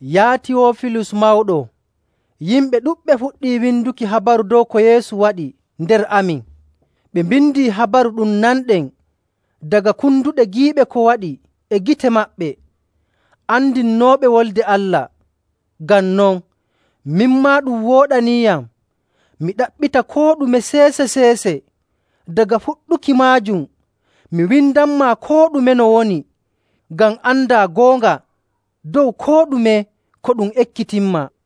Yaa Tiyoofilus mawɗo, Yimɓe ɗuɗɓe fuɗɗii winduki habaru dow ko Yeesu waɗi nder amin. Ɓe mbindi habaru ɗum nanɗen daga konduɗe giiɓe ko waɗi e gite maɓɓe, andinooɓe Wolde Allah. Ngam non, min maa ɗum wooɗaniiyam mi ɗaɓɓita koo ɗume e seese‑seese daga fuɗɗuki maajum, mi windanmaa koo ɗume no woni, ngam andaa goonga dow koo ɗume ko ɗum ekkitinmaa.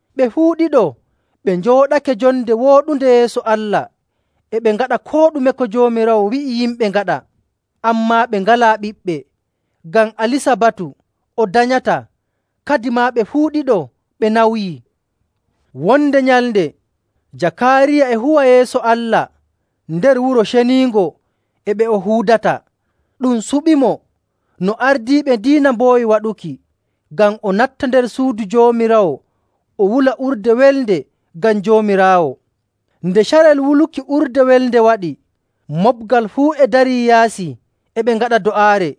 Ɓe fuu ɗiɗo ɓe njooɗake jonde wooɗunde yeeso Allah, e ɓe ngaɗa koo ɗume ko Joomiraawo wi'i yimɓe ngaɗa. Ammaa ɓe ngalaa ɓiɓɓe, ngam Alisabatu o danyataa, kadimaa ɓe fuu ɗiɗo ɓe nawyii. Wonde nyalnde Jakaariya e huwa yeeso Allah nder Wuro Ceniingo e ɓe o huudata. Ɗum suɓiimo, no ardiiɓe diina mboowi waɗuki, ngam o natta nder Suudu Joomiraawo o wula urde welnde ngam Joomiraawo. Nde carel wuluki urde welnde waɗi, moɓgal fuu e dari yaasi e ɓe ngaɗa do'aare.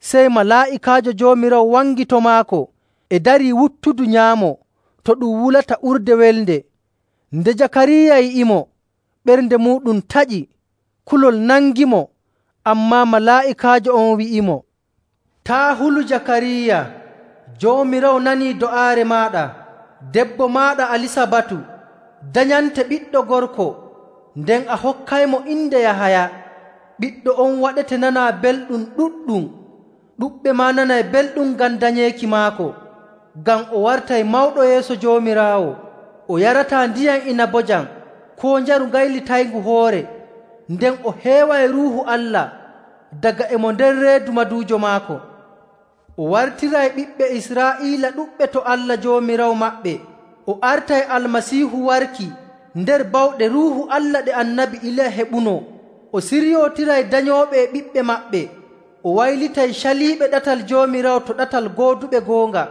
Sey malaa'ikaajo Joomiraawo wangi to maako e darii wuttudu nyaamo to ɗum wulata urde welnde. Nde Jakaariya yi'imo, ɓernde muuɗum taƴi, kulol nangimo. Ammaa malaa'ikaajo on wi'imo, “Taa' hulu Jakaariya, Joomiraawo nanii do'aare maaɗa. Debbo maaɗa Alisabatu danyante ɓiɗɗo gorko, nden a hokkaymo inde Yahaya. Ɓiɗɗo on waɗete nanaa belɗum ɗuɗɗum, ɗuɗɓe maa nanay belɗum ngam danyeeki maako, ngam o wartay mawɗo yeeso Joomiraawo. O yarataa ndiyam inabojam koo njaru gaylitayngu hoore, nden o heeway Ruuhu Allah daga e mo nder reedu maduujo maako.. O wartiray ɓiɓɓe Israa'iila ɗuɗɓe to Allah Joomiraawo maɓɓe. O artay Almasiihu warki nder bawɗe Ruuhu Allah ɗe Annabi Iliya heɓunoo, o siryootiray danyooɓe e ɓiɓɓe maɓɓe. O waylitay caliiɓe ɗatal Joomiraawo to ɗatal gooduɓe goonga.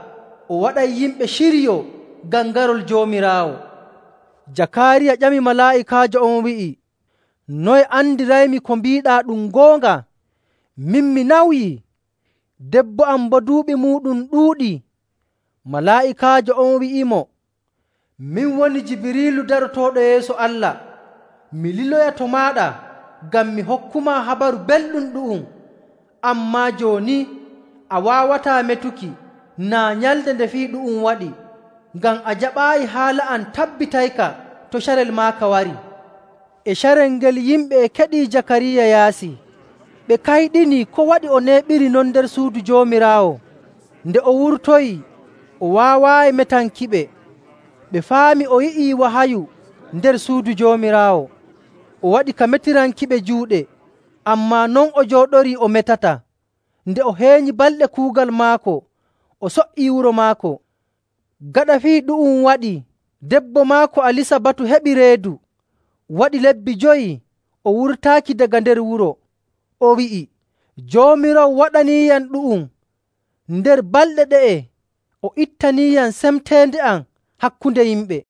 O waɗay yimɓe ciryoo ngam garol Joomiraawo.”. Jakaariya ƴami malaa'ikaajo on wi'i, “Noye andiraymi ko mbiiɗaa ɗum goonga? Min, mi nawyii, debbo am boo duuɓi muuɗum ɗuuɗii.” Malaa'ikaajo on wi'imo, “Min woni Jibiriilu darotooɗo yeeso Allah, mi liloyaa to maaɗa ngam mi hokkumaa Habaru Belɗum ɗu'um.. Ammaa jooni a waawataa metuki naa nyalnde nde fii ɗu'um waɗi, ngam a jaɓaayi haala am tabbitayka to carel maaka warii.” E carel ngel yimɓe e keɗii Jakaariya yaasi, ɓe kayɗinii ko waɗi o neeɓiri non nder Suudu Joomiraawo. Nde o wurtoyii, o waawaayi metankiɓe. Ɓe faami o yi'i wahayu nder Suudu Joomiraawo. O waɗi ka metirankiɓe juuɗe, ammaa non o jooɗorii o metataa. Nde o heenyi balɗe kuugal maako, o so''ii wuro maako. Gaɗa fii ɗu'um waɗii, debbo maako Alisabatu heɓi reedu, waɗi lebbi jowi o wurtaaki daga nder wuro. O wi'i, “Joomiraawo waɗaniiyam ɗu'um. Nder balɗe ɗe'e, o ittaniiyam semteende am hakkunde yimɓe.”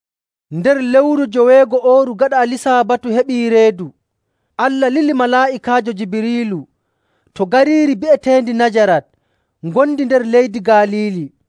Nder lewru joweego'ooru gaɗa Alisabatu heɓii reedu, Allah lili malaa'ikaajo Jibiriilu to gariiri bi'eteendi Najarat ngondi nder leydi Galiili.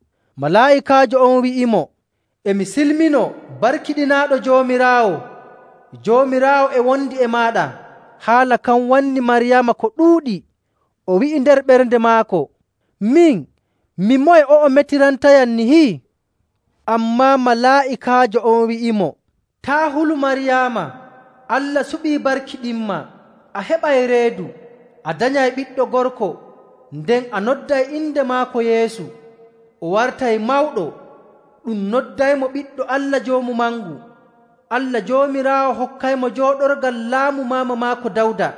Malaa'ikaajo on wi'imo, “E mi silminoo, barkiɗinaaɗo Joomiraawo! Joomiraawo e wondi e maaɗa!” Haala kan wannii Maryaama ko ɗuuɗi. O wi'i nder ɓernde maako, “Min, mi moye o'o mettirantayam nihi?” Ammaa malaa'ikaajo on wi'imo, “Taa' hulu, Maryaama, Allah suɓii barkiɗinmaa. A heɓay reedu, a danyay ɓiɗɗo gorko, nden a nodday inde maako Yeesu.. O wartay mawɗo, ɗum noddaymo Ɓiɗɗo Allah Joomu Mangu. Allah Joomiraawo hokkaymo jooɗorgal laamu maama maako Dawda.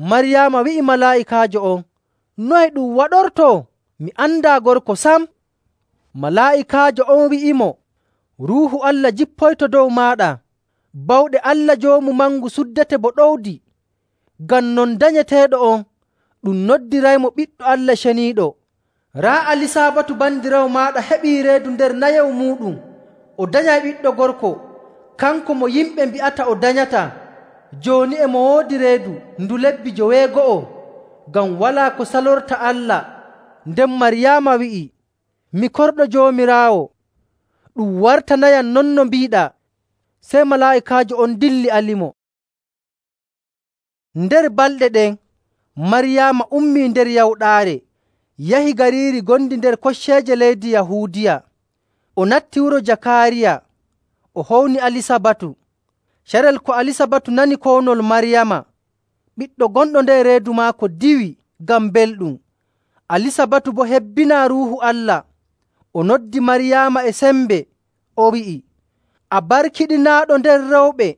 Maryaama wi'i malaa'ikaajo on, “Noye ɗum waɗortoo? Mi andaa gorko sam.” Malaa'ikaajo on wi'imo, “Ruuhu Allah jippoyto dow maaɗa, bawɗe Allah Joomu Mangu suddete bo ɗowdi. Ngam non, danyeteeɗo on ɗum noddiraymo ‘Ɓiɗɗo Allah, Ceniiɗo.’ Raa, Alisabatu bandiraawo maaɗa heɓii reedu nder nayewu muuɗum, o danyay ɓiɗɗo gorko. Kanko mo yimɓe mbi'ata o danyataa, jooni e mo woodi reedu ndu lebbi joweego'o. Ngam walaa ko salorta Allah.”. Nden Maryaama wi'i, “Mi korɗo Joomiraawo, ɗum wartanayam non no mbiiɗaa.” Sey malaa'ikaajo on dilli alimo. Nder balɗe ɗen, Maryaama ummii nder yawɗaare yahi gariiri ngondi nder kocceeje leydi Yahuudiya. O natti wuro Jakaariya, o howni Alisabatu. Carel ko Alisabatu nani kownol Maryaama, ɓiɗɗo gonɗo nder reedu maako diwi ngam belɗum, Alisabatu boo hebbinaa Ruuhu Allah. O noddi Maryaama e sembe, o wi'i, “A barkiɗinaaɗo nder rewɓe!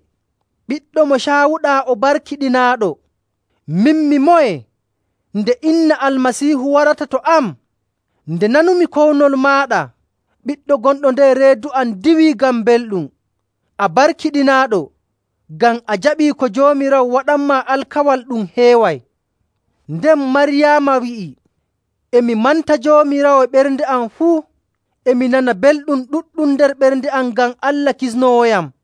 Ɓiɗɗo mo caawuɗaa o barkiɗinaaɗo. Min, mi moye nde inna Almasiihu warata to am? Nde nanumi kownol maaɗa, ɓiɗɗo gonɗo nder reedu am diwii ngam belɗum. A barkiɗinaaɗo ngam a jaɓii ko Joomiraawo waɗanmaa alkawal ɗum heeway.” Nden Maryaama wi'i, “E mi manta Joomiraawo e ɓernde am fuu. E mi nana belɗum ɗuɗɗum nder ɓernde am ngam Allah, Kisnoowoyam,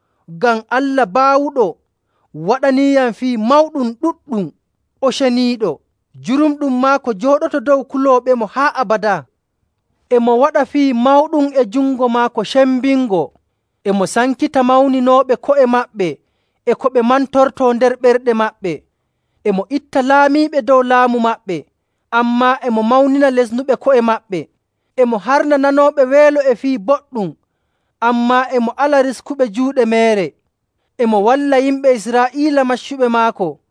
ngam Allah Baawuɗo waɗaniiyam fii mawɗum ɗuɗɗum, o ceniiɗo. Jurumɗum maako jooɗoto dow kulooɓemo haa abadaa. E mo waɗa fii mawɗum e jungo maako sembingo, e mo sankita mawninɓe ko'e maɓɓe e ko ɓe mantortoo nder ɓerɗe maɓɓe. E mo itta laamiiɓe dow laamu maɓɓe, ammaa e mo mawnina lesnuɓe ko'e maɓɓe.. E mo harna nanooɓe weelo e fii boɗɗum, ammaa e mo ala riskuɓe juuɗe meere. E mo walla yimɓe Israa'iila maccuɓe maako,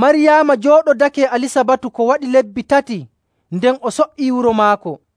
Maryaama jooɗodake e Alisabatu ko waɗi lebbi tati, nden o so''ii wuro maako.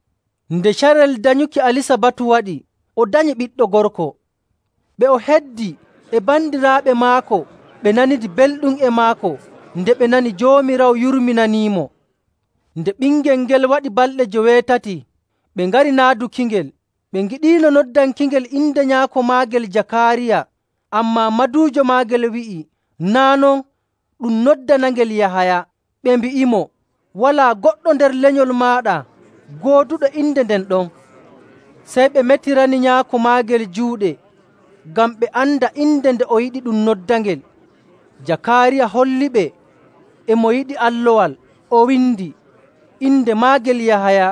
Nde carel danyuki Alisabatu waɗi, o danyi ɓiɗɗo gorko. Ɓe o heddi e bandiraaɓe maako ɓe nanidi belɗum e maako nde ɓe nani Joomiraawo yurminanimo. Nde ɓingel ngel waɗi balɗe joweetati, ɓe ngari naadukingel. Ɓe ngiɗiino noddankingel inde nyaako maagel Jakaariya.. Ammaa maduujo maagel wi'i, “Naa' non, ɗum noddanangel Yahaya.” Ɓe mbi'imo, “Walaa goɗɗo nder lenyol maaɗa gooduɗo inde nden ɗon.” Sey ɓe metirani nyaako maagel juuɗe, ngam ɓe anda inde nde o yiɗi ɗum noddanangel. Jakaariya holliɓe e mo yiɗi allowal, o windi, “Inde maagel Yahaya.”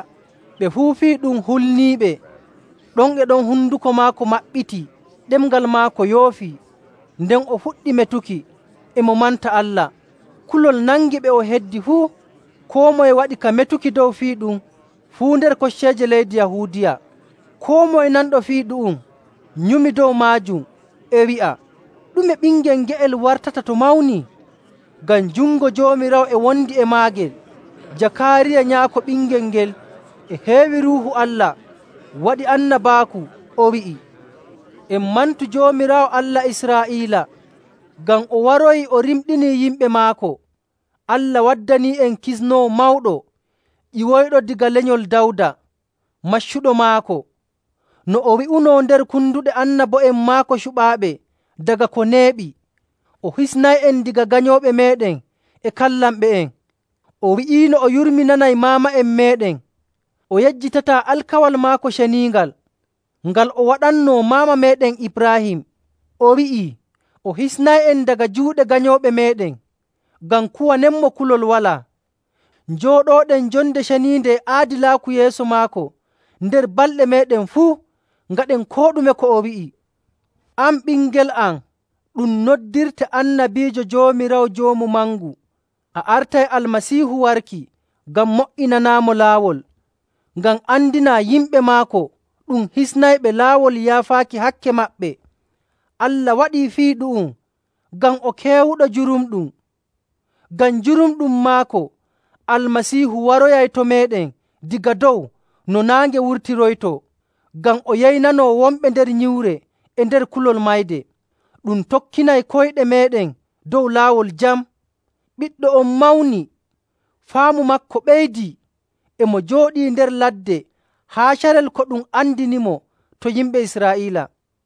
Ɓe fuu fii ɗum hulniiɓe. Ɗon e ɗon, honduko maako maɓɓitii, ɗemngal maako yoofi, nden o fuɗɗi metuki, e mo manta Allah. Kulol nangi ɓe o heddi fuu, koo moye waɗi ka metuki dow fii ɗum fuu nder kocceeje leydi Yahuudiya. Koo moye nanɗo fii ɗu'um nyumi dow maajum, e wi'a, “Ɗume ɓingel nge'el wartata to mawni?” Ngam jungo Joomiraawo e wondi e maagel. Jakaariya, nyaako ɓingel ngel, e heewi Ruuhu Allah, waɗi annabaaku, o wi'i, “En mantu Joomiraawo, Allah Israa'iila, ngam o waroyii o rimɗinii yimɓe maako. Allah waddanii'en kisnoowo mawɗo ƴiwoyɗo daga lenyol Dawda, maccuɗo maako. No o wi'unoo nder konduɗe annabo'en maako cuɓaaɓe daga ko neeɓi, o hisnay'en daga ganyooɓe meeɗen e kallanɓe'en. O wi'iino o yurminanay maama'en meeɗen, o yejjitataa alkawal maako ceniingal, ngal o waɗannoo maama meeɗen Ibraahim. O wi'ii o hisnay'en daga juuɗe ganyooɓe meeɗen, ngam kuwanenmo kulol walaa, njooɗooɗen jonde ceniinde e aadilaaku yeeso maako nder balɗe meeɗen fuu, ngaɗen koo ɗume ko o wi'i. “An ɓingel am, ɗum noddirte annabiijo Joomiraawo Joomu Mangu, a artay Almasiihu warki ngam mo''inanaamo laawol,. ngam andinaa yimɓe maako ɗum hisnayɓe laawol yaafaaki hakke maɓɓe. Allah waɗii fii ɗu'um ngam o keewuɗo jurumɗum. Ngam jurumɗum maako, Almasiihu waroyay to meeɗen daga dow no naange wurtiroytoo, ngam o yeynanoo wonɓe nder nyiwre e nder kulol mayde, ɗum tokkinay koyɗe meeɗen dow laawol jam.”. Ɓiɗɗo on mawni, faamu maako ɓeydii. E mo jooɗii nder ladde haa carel ko ɗum andinimo to yimɓe Israa'iila.